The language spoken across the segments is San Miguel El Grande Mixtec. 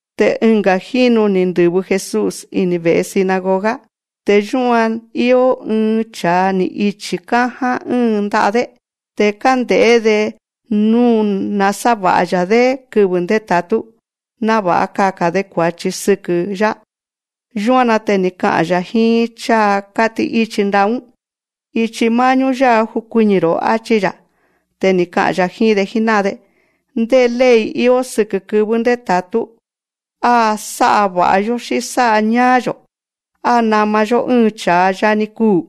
Te ɨnga̱ jínu ni̱ ndɨ̱vɨ Jesús ini̱ ve̱'e sinagoga. Te yúan ni̱ i̱o ɨɨn cha̱a ni̱ ichi̱ káján ɨ́ɨn nda'a‑dé. Te kánde̱'é‑de nú nasáva̱'a‑ya̱‑dé kɨvɨ̱ ndéta̱tú, náva̱'a kaka̱n‑de kua̱chi sɨkɨ̱‑yá. Yúan‑na te ni̱ ka'a̱n‑ya̱ jíín cháa kátí'íchi nda'a‑ún: Ichi má'ñú yá'a jukuiñi̱‑ro̱, áchí‑ya̱. Te ni̱ ka'a̱n‑ya̱ jíín‑de jíná'an‑de: Ndé ley íó sɨkɨ̱ kɨvɨ́ ndéta̱tú. Á sá'a va̱'a‑yó, xí sá'a ñáá‑yo̱. Á nama‑yó ɨ́ɨn cha̱a a yani kuu̱,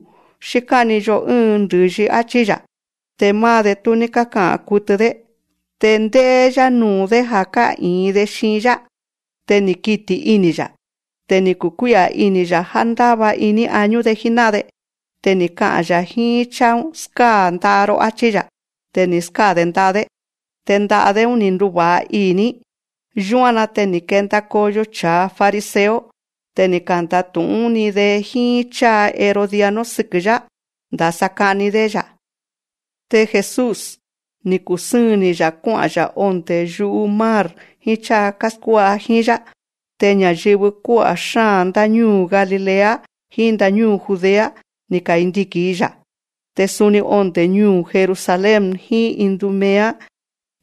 xí ká'ni‑yo ɨ́ɨn ndɨ̱yi, áchí‑ya̱. Te máá‑de, tú ní káka'a̱n kutɨ‑dé. Te ndé'é‑yá nuu̱‑dé ja̱ ká'i̱in‑de xiin‑yá. Te ni̱ kiti̱ ini̱‑ya̱. Te ni̱ kukuí'a̱ ini̱‑ya̱ já ndáva iní añú‑de jíná'an‑de. Te ni̱ ka'a̱n‑ya̱ jíín cháa‑ún: Skáa̱ nda'a‑ro, áchí‑ya̱. Te ni̱ skáa̱‑de nda'a‑dé. Te nda'a‑dé‑ún, ni̱ nduva̱'a ii̱‑ní. Yúan‑na te ni̱ kenda koyo cha̱a fariseo. Te ni̱ kanda̱tu̱'ún‑ni‑de jíín cháa herodiano sɨkɨ̱‑yá, ndasa ka'ni‑dé‑ya̱. Te Jesús, ni̱ kusɨ́ɨn‑ni‑ya̱ kuá'a̱n‑ya̱ ondé yu'u mar jíín cháa káskuá'a jíín‑yá. Te ña̱yɨvɨ kuá'a̱ xáa̱n ndáñúu̱ Galilea jíín ndáñúu̱ Judea, ni̱ kandiki̱n‑i‑ya̱. Te suni onde̱ ñuu̱ Jerusalén jíín Idumea,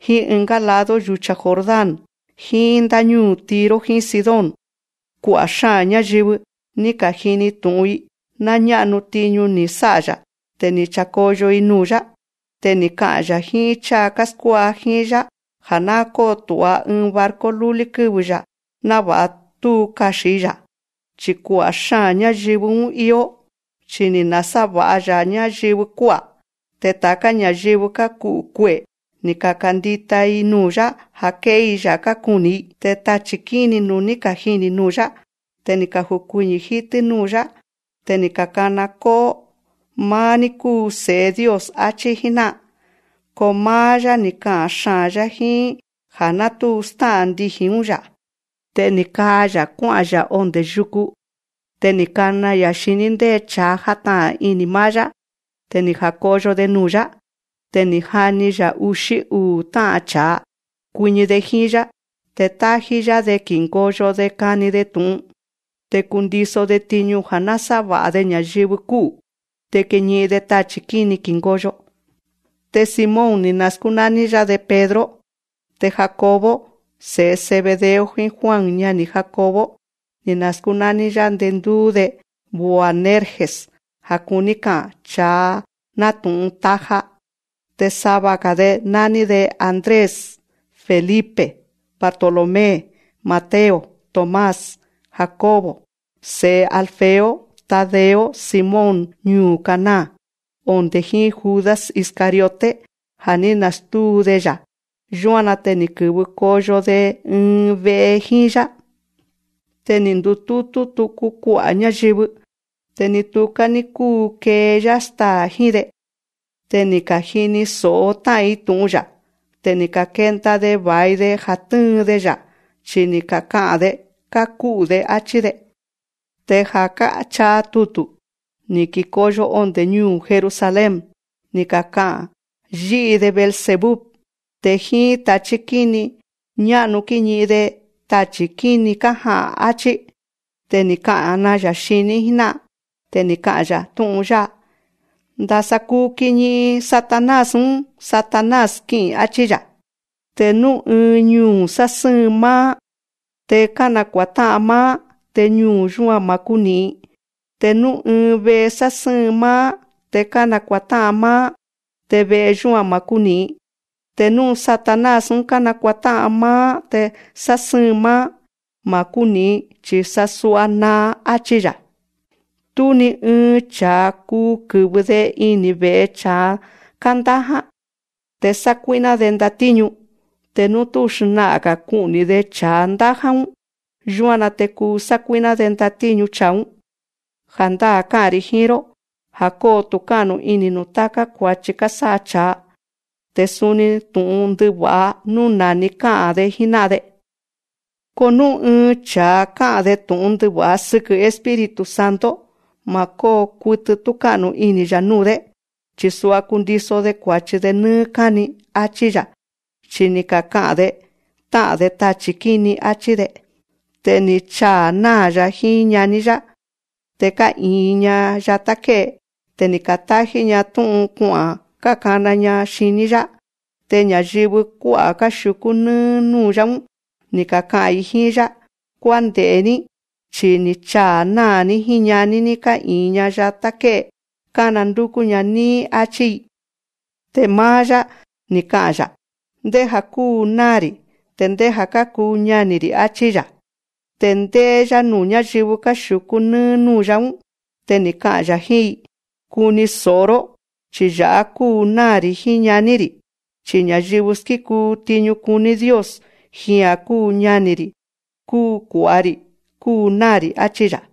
jíín ɨngá lado yu̱cha Jordán, jíín ndáñúu̱ Tiro jíín Sidón. Kua'a̱ xáa̱n ñáyɨvɨ, ni̱ ka̱jini tu̱'un‑i ná ñá'nu tiñu ni̱ sá'a‑ya̱. Te ni̱ cha̱koyo‑i nuu̱‑yá. Te ni̱ ka'a̱n‑ya̱ jíín cháa káskuá'a jíín‑yá ja̱ ná kótu̱'a ɨɨn barco lúlí kɨ́vɨ‑ya̱, náva̱'a tú kaxi̱n‑i‑ya̱. Chi̱ kua'a̱ xáa̱n ñáyɨvɨ‑ún íó. Chi ni̱ nasáva̱'a‑ya̱ ñáyɨvɨ kuá'a̱. Te ta̱ká ña̱yɨvɨ káku'u̱ kue'e̱, ni̱ ka̱kandita‑i nuu̱‑yá, ja̱ ké'é‑i‑ya̱ kákuni̱‑i. Te tachi̱ kíni nú ni̱ kajini̱ nuu̱‑yá, te kájukuiñi̱ jítɨ́ núu̱‑yá. Te kákana kó'ó: Máá‑ní kúu Se̱'e Dios, áchí jíná'an. Ko máá‑yá, ni̱ ka'a̱n xaa̱n‑yá jíín já ná tú stá'a̱n ndiji̱n‑ún‑yá. Te ni̱ kaa‑ya̱ kuá'a̱n‑ya̱ ondé yuku. Te ni̱ kana‑ya̱ xiní ndé cha̱a játa'a̱n ini̱ máá‑yá. Te ni̱ ja̱koyo‑de nuu̱‑yá. Te ni̱ jani‑ya̱ uxí uu̱ tá'a̱n cha̱a, kuiñi‑de jíín‑yá. Te tájí‑yá‑de ki̱ngoyo‑de kani‑de tu̱'un. Te kundiso‑de tiñu ja̱ násáva̱'a‑de ña̱yɨvɨ kú'u̱. Te kiñi'in‑de tachi̱ kíni ki̱ngoyo. Te Simón, ni̱ naskúnání‑yá‑de Pedro. Te Jacobo, se̱'e Zebedeo, jíín Juan ñani̱ Jacobo, ni̱ naskúnání‑yá ndendúú‑de Boanerges, ja̱ kuní ka'a̱n: Cha̱a nátu̱'un taja. Te sava‑ga̱‑de nání‑de Andrés, Felipe, Bartolomé, Mateo, Tomás, Jacobo se̱'e Alfeo, Tadeo, Simón ñuu̱ Caná, onde̱ jíín Judas Iscariote, ja̱ ní nastúu‑de‑ya̱. Yúan‑na te ni̱ kɨ̱vɨ koyo‑de ɨɨn ve'e jíín‑yá. Te ni̱ ndutútú tuku kua'a̱ ñáyɨvɨ. Te ni tuká ní kúu kee‑yá staa̱ jíín‑de. Te ni̱ ka̱jini tu̱'un tá'an‑ya̱. Te ni̱ ka̱kenda‑de va̱i‑de ja̱ tɨ́ɨn‑de‑ya̱. Chi ni̱ kaka'a̱n‑de: Káku'u̱‑de, áchí‑de. Te ja̱ káchaa tutu̱, ni̱ kikoyo onde̱ ñuu̱ Jerusalén, ni̱ kaka'a̱n: Yí'i‑de Beelzebú. Te jíín tachí kíni ñá'nu kíñi'in‑de tachi̱ kíni kája'a̱n, áchí. Te ni̱ kana‑ya̱ xiní jíná'an. Te ni̱ ka'a̱n‑ya̱ tú'un yátá jíín: Ndasa kuu kiñi'in Satanás‑ún Satanás kí'i̱n, áchí‑ya̱. Te nú ɨɨn ñuu̱ sásɨ́ɨn máá te kánakua̱tá'an máá, te ñuu̱ yúan ma̱ kúni̱'in. Te nú ɨɨn ve'e sásɨ́ɨn máá te kánakua̱tá'an máá, te ve'e yúan ma̱ kúni̱'in. Te nú Satanás kánakua̱tá'an máá te sásɨ́ɨn máá, ma̱ kúni̱'in, chi̱ sasua naa, áchí‑ya̱. Tú ni ɨɨn cha̱a kuu kɨ̱vɨ‑de ini̱ ve̱'e cha̱a kándáján te sákuí'ná‑de ndatíñu, te nú tú xna'a̱n‑ga̱ ku'ni̱‑de cha̱a ndáján‑ún. Yúan‑na te kuu sákuí'ná‑de ndatíñu cha̱a‑ún. Ja̱ndáa̱ ká'a̱n‑ri̱ jíín‑ró já kóo tu̱ká'nu ini̱ nuu̱ táká kua̱chi kásá'a cha̱a, te suni nuu̱ tú'un ndɨva̱'a nú na̱ni ka'a̱n‑de jíná'an‑de. Ko nú ɨɨn cha̱a ká'a̱n‑de tu̱'un ndɨva̱'a sɨkɨ̱ Espíritu Santo, ma̱ kóo kutɨ túká'nu ini̱‑ya̱ núu̱‑dé, chi̱ sua kundiso‑de kua̱chi nɨ́ɨ́ káni, áchí‑ya̱. Chi ni̱ kaka'a̱n‑de: Tá'a̱n‑de tachi̱ kíni, áchí‑de. Te ni̱ chaa̱ náa̱‑ya̱ jíín ñaní‑ya̱, te ká'i̱in‑ña yatá ké'e. Te ni̱ ka̱tájí‑ña tú'un kua'a̱n kákana‑ña xiní‑yá. Te ña̱yɨvɨ kuá'a̱ káxiu̱kú nɨ́ɨ́ núu̱‑yá‑ún, ni̱ kaka'a̱n‑i jíín‑yá: Kuánde̱'é‑ní, chi ni̱ chaa̱ náa̱‑ní jíín ñaní‑ní ká'i̱in‑ña yatá ké'e kánandúkú‑ña níí, áchí‑i. Te máá‑yá, ni̱ ka'a̱n‑ya̱: Ndéja̱ kúu náa̱‑ri̱ te ndéja̱ kákuu ñani̱‑ri̱, áchí‑ya̱. Te ndé'é‑yá nuu̱ ñáyɨvɨ káxiu̱kú nɨ́ɨ́ núu̱‑yá‑ún, te ni̱ ka'a̱n‑ya̱ jíín‑i: Kuni so̱'o‑ró, chi ya̱'á kúu náa̱‑ri̱ jíín ñaní‑ri̱. Chi ña̱yɨvɨ skíkuu tiñu kuní Dios, jia̱n kúu ñani̱‑ri̱, kúu kua̱'a‑ri̱, kúu náa̱‑ri̱, áchí‑ya̱.